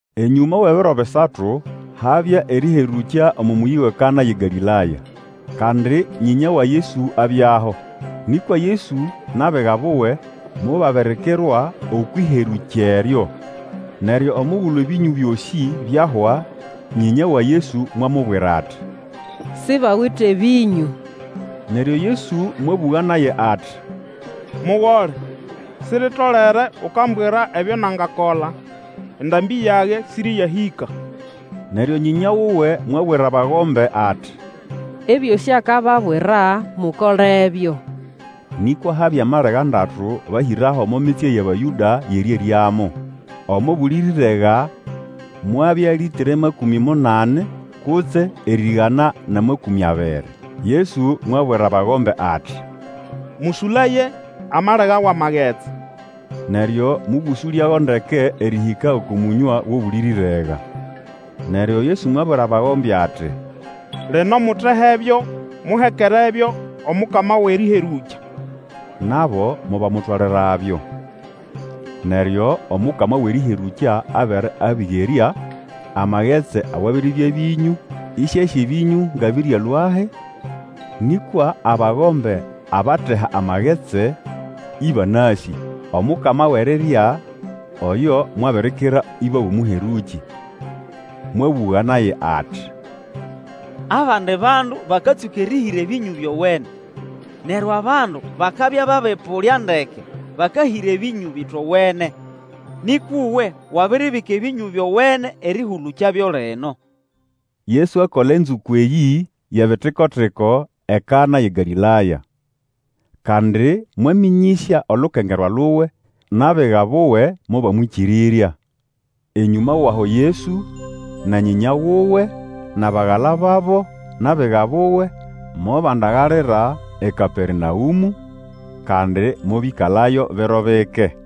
Enyũma wʼebiro bisatu habya erĩherũkya omo mũyĩ wʼeKana yʼeGalĩlaya, kandi nyĩnya wa Yesu abyaho. Nĩkwa Yesu nʼabiga buwe mobabirikirwa okwʼĩherũkya eryo. Neryo omugulu ebĩnyũ byosĩea byahwa, nyĩnya wa Yesu mwamubwira ati, Sibawite bĩnyũ. Neryo Yesu mwabũga naye ati, Mugole, siritolere ukambwira ebyo nangakola, endambĩ yage siriyahĩka. Neryo nyĩnya wuwe mwabwira abagombe ati, Ebyosĩ akababwira, mukolebyo. Nĩkwa habya malega ndatu bahĩraho omo mitsye yʼAbayũda yʼerĩeryamo. Omo buli rĩrega mwabya lĩtre makũmĩ munani kutse erĩgana nʼamakũmĩ abiri. Yesu mwabwira abagombe ati, Mũsũlaye amalega wʼamagetsi. Neryo mobũsũlyago ndeke erĩhĩka oko mũnywa gʼobuli rĩrega. Neryo Yesu mwabwira abagombe ati, Lino mutehebyo muhekerebyo omukama wʼerĩherũkya. Nabo mobamutwalirabyo. Neryo omukama wʼerĩherũkya abere abigerya amagetsi awabiribya bĩnyũ, ĩsĩasĩ ebĩnyũ nga bĩryalũahi, nĩkwa abagombe abateha amagetsi ĩbanasĩ, omukama wʼerirya oyo mwabirikira ĩba wʼomũherũkĩ. Mwabũga naye ati, Abandi bandu bakatsũka erĩhĩra ebĩnyũ byowene; neryo abandu bakabya babĩpũlya ndeke, bakahĩra ebĩnyũ ebĩtowene. Nĩkwa uwe wabiribika ebĩnyũ byowene erĩhũlũkyabyo lino. Yesu akola enzũko eyĩ yʼebitikotiko eKana yʼeGalĩlaya. Kandi mwamĩnyĩsya olukengerwa luwe, nʼabiga buwe mobamwĩkĩrĩrya. Enyũma wʼaho Yesu, na nyĩnya wuwe, nʼabagala babo, nʼabiga buwe, mobandagalira eKapernaũmũ, kandi mobĩkalayo biro bike.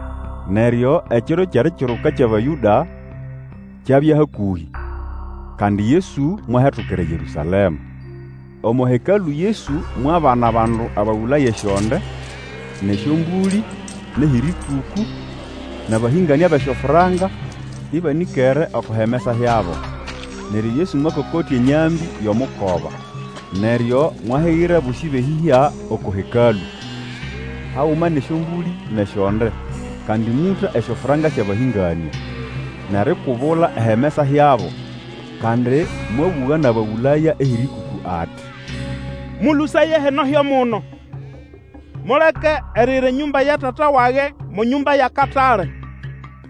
Neryo Ekiro kyʼErikiruka kyʼAbayũda kyabya hakũhĩ, kandi Yesu mwahetukira eYerũsalema. Omo Hekalũ Yesu mwabana abandu abagũlaya esyonde, nʼesyombũlĩ, nʼehĩrĩkũkũ, nʼabahĩnganĩa bʼesyofranka ĩbanĩkere oko himesa hyabo. Neryo Yesu mwakokotya enyambĩ yʼomukoba, neryo mwahigira abosĩ bʼeyĩhya oko Hekalũ, haguma nʼesyombũlĩ nʼesyonde. Kandi mũta esyofranka syʼabahĩnganĩa, nʼerikubula ehimesa hyabo. Kandi mwabũga nʼabagũlaya ehĩrĩkũkũ ati, Mũlũsaye hino hyo muno! Muleke eriyira enyũmba ya Tata wage mo nyũmba yʼakatale.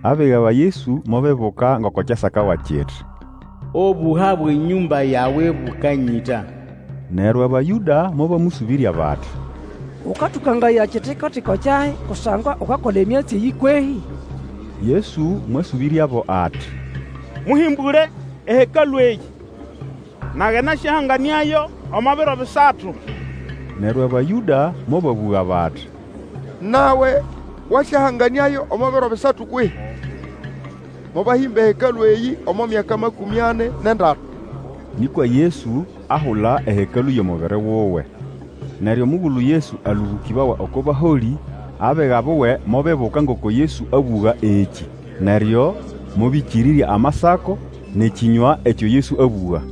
Abiga ba Yesu mobibuka ngoko kyasakawa kiti, Obũha bwʼenyũmba yawe bũkanyĩta. Neryo Abayũda mobamũsũbĩrya bati, Ũkatũkangaya ekitiko-tiko kyahi kusangwa ukakola emyatsi eyĩ kwehĩ? Yesu mwasũbĩryabo ati, Mũhĩmbũle eHekalũ eyĩ, nage nasyahanganĩayo omo biro bisatu. Neryo Abayũda mobabũga bati, Nawe wasyahanganĩayo omo biro bisatu kwehĩ? Mobahĩmba eHekalũ eyĩ omo mĩaka makũmĩ ani nʼendatu! Nĩkwa Yesu ahula ehekalũ yʼomubiri wuwe. Neryo omugulu Yesu alũbũkĩbawa oko baholĩ, abiga buwe mobibuka ngoko Yesu abũga ekĩ; neryo mobĩkĩrĩrya Amasako, nʼekĩnywa ekyo Yesu abũga.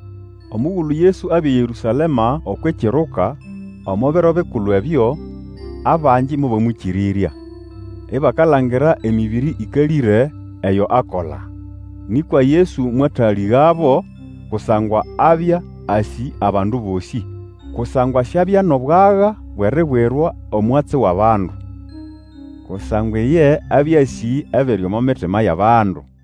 Omugulu Yesu abya eYerũsalema okwʼĨkiruka, omo biro bikulu ebyo, abangi mobamwĩkĩrĩrya, ibakalangira emĩbĩrĩ ĩkalĩre eyo akola. Nĩkwa Yesu mwatalĩgabo, kusangwa abya asĩ abandu bosĩ. Kusangwa siabya nʼobwaga bwʼeribwirwa omwatsi wʼabandu, kusangwa iye abya asĩ ebiri omo mitima yʼabandu.